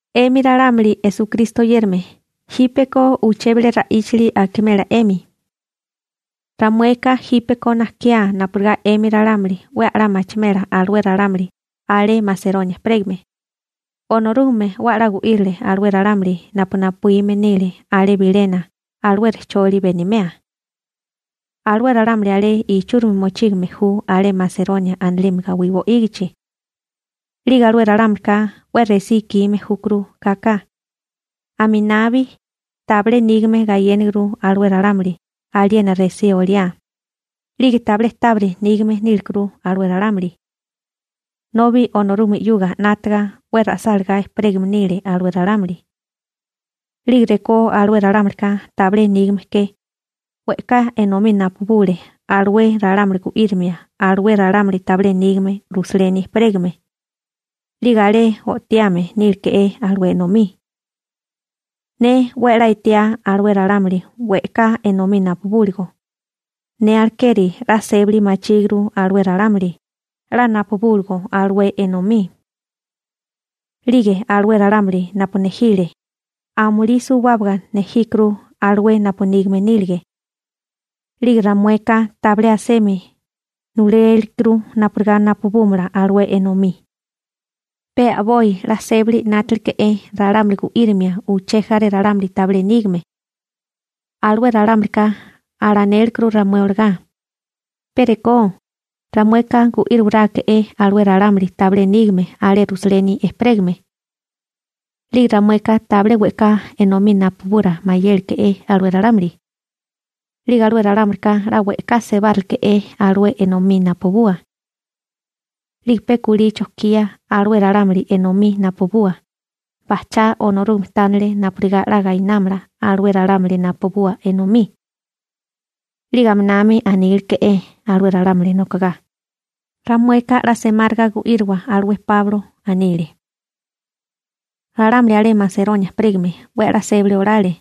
'Emi ralámuli Esukristo oyérame, jípeko uché bilé ra'íchali akimela 'emi. Ramueka jípeko najkiá napurigá 'emi ralámuli 'we a'lá machimela alué ralámuli alé Maseronia ejperégame, Onorúgame 'we a'lá gu'írile alué ralámuli napu napuíme nile alé bilena alué rejcholi benimea. Alué ralámuli alé ichúrimi mochígame ju alé Maseronia anilime gawí bo'ígichi. 'Lige alué ralámulika 'we resí ikime júkuru kaka. Aminami tabilé nígame gayéniguru alué ralámuli aliena resí oliá, 'lige tabilé tábiri nígame nílekuru alué ralámuli, nobi Onorúgame 'yuga 'nátaga 'we ra'sálagá ejperégame nile alué ralámuli. 'Lige rekó alué ralámulika tabilé nígame ke, we'ká enomí napubule alué ralámuli gu'írimia alué ralámuli tabilé nígame Rusaleni ejperégame, 'lige alé o'tiame níleke'é alué enomí. Ne 'we a'lá etiá alué ralámuli we'ká enomí napubúligo, ne alekeri 'la sébali machíguru alué ralámuli 'la napubúligo alué enomí. 'Lige alué ralámuli napu nejile, amulí suwábaga nejíkuru alué napu nígame nílige. 'Lige ramueka tabilé asemi nulélikuru napurigá napubúmala alué enomí. Pe a'boi 'la sébali 'nátaleke'é ralámuli gu'írimia uché jaré ralámuli tabilé nígame. Alué ralámulika alanékuru ramué olagá: ―Pe rekó, ramueka gu'íriwaráeke'é alué ralámuli tabilé nígame alé Rusaleni ejperégame. 'Lige ramueka tabilé we'ká enomí napubura mayélike'é alué ralámuli. 'Lige alué ralámulika 'la we'ká sebáreleke'é alué enomí napubua. 'Lige pe kulí chojkía alué ralámuli enomí napubua, bajchá Onorúgame tánele napurigá 'la gainámala alué ralámuli napubua enomí. 'Lige aminami aníleke'é alué ralámuli nokogá: ―Ramueka 'la semáriga gu'íriwa alué Páulo ―anile. Ralámuli alé Maseronia ejperégame 'we a'lá sébali olale.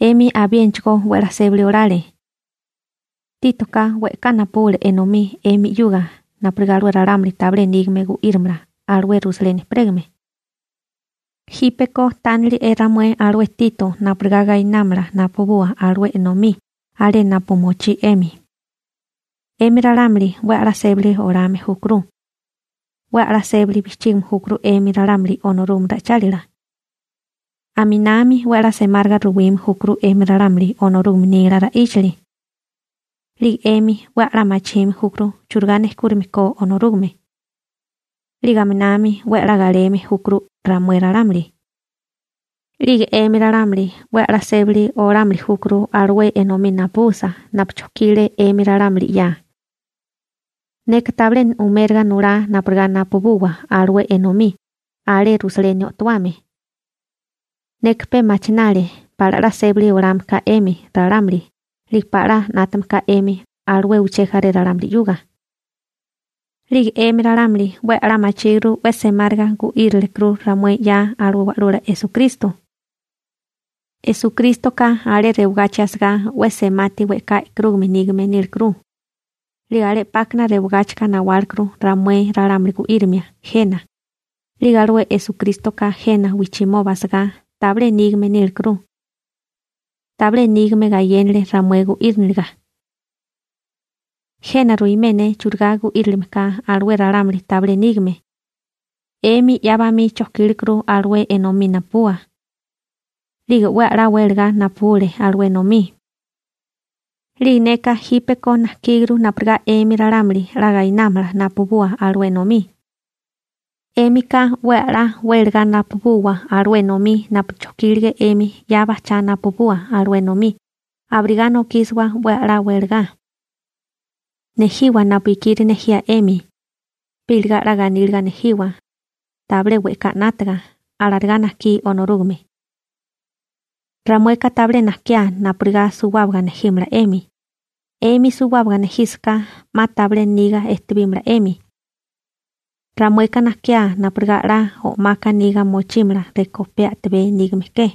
'Emi abiénachigó 'we 'la sébali olale. Títoka we'ká napubule enomí 'emi 'yuga napurigá alué ralámuli tabilé nígame gu'írimala alué Rusaleni ejperégame. Jípeko tánili'e ramué alué Tito napurigá gayénamala napabua alué enomí alé napu mochí 'emi. 'Emi ralámuli 'we a'lá sébali olame júkuru. 'We a'lá sébali bijchígime júkuru 'emi ralámuli Onorúgame ra'ichálila. Aminami 'we a'lá semáriga ruwime júkuru 'emi ralámuli Onorúgame nila ra'íchali. 'Lige 'emi 'we a'lá machime júkuru churigá nejkúrime ko Onorúgame. 'Lige aminami 'we a'lá galeme júkuru ramué ralámuli. 'Lige 'emi ralámuli 'we a'lá sébali olámili júkuru alué enomí napubusa napu chojkile 'emi ralámuli 'ya. Neka tabilé uméraga nulá napurigá napubuwa alué enomí alé Rusaleni o'towame. Neka pe machinale pala 'la sébali olame ka 'emi ralámuli 'lige pala 'la na'temame ka 'emi alué uché jaré ralámuli 'yuga. 'Lige 'emi ralámuli 'we a'lá machíguru 'we semáriga gu'írilekuru ramué 'ya alué Wa'lula Esukristo. Esukrístoka alé rewagachi asagá 'we semati we'ká e'karúgame nígame nílekuru, 'lige alé 'pákana rewagáchika nawálekuru ramué ralámuli gu'írimia jena, 'lige alué Esukrístoka jena wijchimoba asagá tabilé nígame nílekuru. Tabilé nígame gayénale ramué gu'íriniliga. Jena ruimé ne churigá gu'írilime ka alué ralámuli tabilé nígame. 'Emi 'ya bamí chojkílekuru alué enomí napubua. 'Lige 'we a'lá welagá napubule alué enomí. 'Lige neka jípeko najkíguru napurigá 'emi ralámuli 'la gainámala napubua alué enomí. 'Émika 'we a'lá wélagá napubuwa alué enomí napu chojkílige 'emi 'ya bajchá napubuwa alué enomí abirigá nokísiwa 'we a'lá wélagá. Nejiwa napu ikiri nejía 'emi, pe iligá 'la ganíliga nejiwa, tabilé we'ká 'nátaga. Alarigá najkí Onorúgame. Ramueka tabilé najkiá napurigá suwábaga nejímala 'emi. 'Emi suwábaga nejísaká, 'ma tabilé niga ejtibímala 'emi. Ramueka najkiá napurigá 'la o'maka niga mochímala rekó pe a'tabé nígame ke.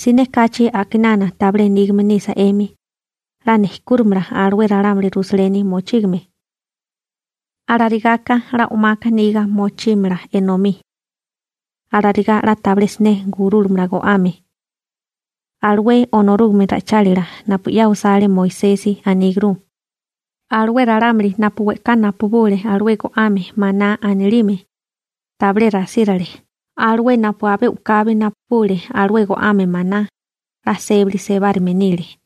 Siné kachi a'kinana tabilé nígame nisa 'emi, 'la nejkúrimala alué ralámuli Rusaleni mochígame. Alarigaka 'la o'maka niga mochímala enomí. Alarigá 'la tabilé siné gurúlamala go'ame. Alué Onorúgame ra'ichálila napu 'ya osale Moisesi, aníguru: «Alué ralámuli napu we'ká napubule alué go'ame maná anilime, tabilé rasírale. Alué napu abé u'kabi napubule alué go'ame maná, 'la sébali sebárime nile.»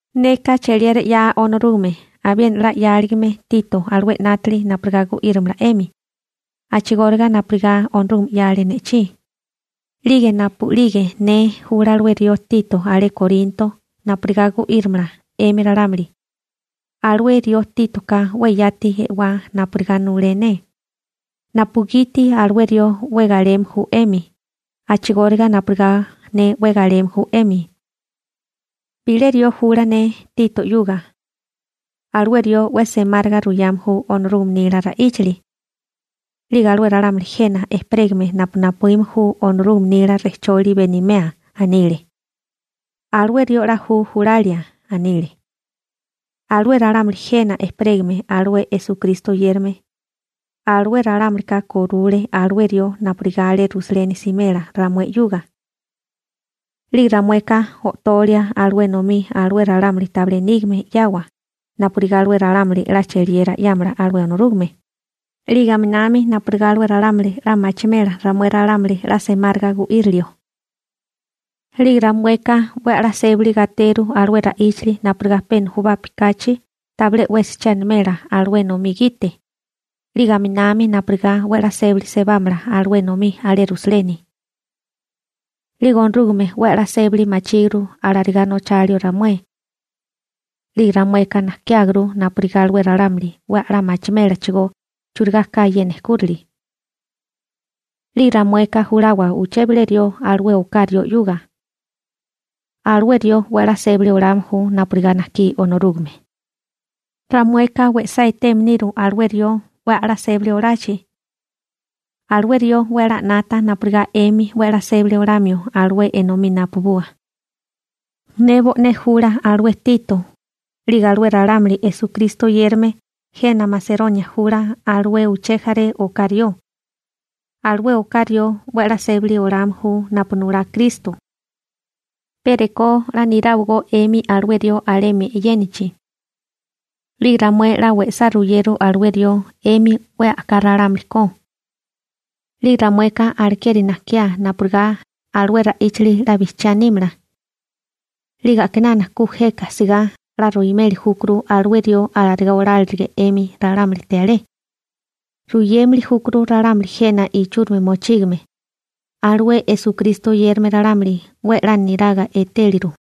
Neka cheliera 'ya Onorúgame abiena 'la 'yáligame Tito alué 'nátili napurigá gu'írimala 'emi, a'chigóriga napurigá Onorúgame 'yale ne'chí. 'Lige napu'lige ne jula alué rió Tito alé Korinto, napurigá gu'írimala 'emi ralámuli, alué rió Títoka 'we yati e'wá napurigá nulé ne, napugiti alué rió 'we galeme ju 'emi a'chigóriga napurigá ne 'we galeme ju 'emi. Bilé rió jula ne Tito 'yuga. Alué rió 'we semáriga ruyame ju Onorúgame nila ra'íchali. 'Lige alué ralámuli jena ejperégame napu napuíme ju Onorúgame nila rejcholi benimea, anile: ―Alué rió 'la ju julalia ―anile. Alué ralámuli jena ejperégame alué Esukristo oyérame, alué ralámulika korule alué rió napurigá alé Rusaleni simela ramué 'yuga. 'Lige ramueka o'tolia alué enomí alué ralámuli tabilé nígame 'yawa napurigá alué ralámuli 'la cheliera 'yámala alué Onorúgame, 'lige aminami napurigá alué ralámuli 'la machimela ramué ralámuli 'la semáriga gu'irilio. 'Lige ramueka 'we a'lá sébali gateru alué ra'íchali napurigá pe nujubapi kachi tabilé 'wesi che animela alué enomí gite, 'lige aminami napurigá 'we a'lá sébali sebámala alué enomí alé Rusaleni. 'Lige Onorúgame 'we a'lá sébali machíguru alarigá nochalio ramué. 'Lige ramueka najkiáguru napurigá alué ralámuli 'we a'lá machimélachigó churigá ka ye nejkúrali. 'Lige ramueka julawa uché bilé rió alué oká rió 'yuga. Alué rió 'we a'lá sébali olame ju napurigá najkí Onorúgame. Ramueka we'sá eteme niru alué rió 'we a'lá sébali olachi. Alué rió 'we 'la 'nata napurigá 'emi 'we 'la sébali olamio alué enomí napubua. Ne bo'né jula alué Tito, 'lige alué ralámuli Esukristo oyérame jena Maseronia jula alué uché jaré oká rió. Alué oká rió 'we 'la sébali olame ju napu nulá Kristo. Pe rekó 'la niráwagó 'emi alué rió alemi e'yénachi. 'Lige ramué 'la we'sá ruyeru alué rió 'emi 'we a'ká ralámuli ko. 'Lige ramueka alekeri najkiá napurigá alué ra'íchali 'la bijchiá nímala. 'Lige a'kinana ku jeka sigá 'la ruimeli júkuru alué rió alarigá olárilige 'emi ralámulite alé. Ruyémili júkuru ralámuli jena ichúrimi mochígame, alué Esukristo oyérame ralámuli, 'we 'la niraga etéliru.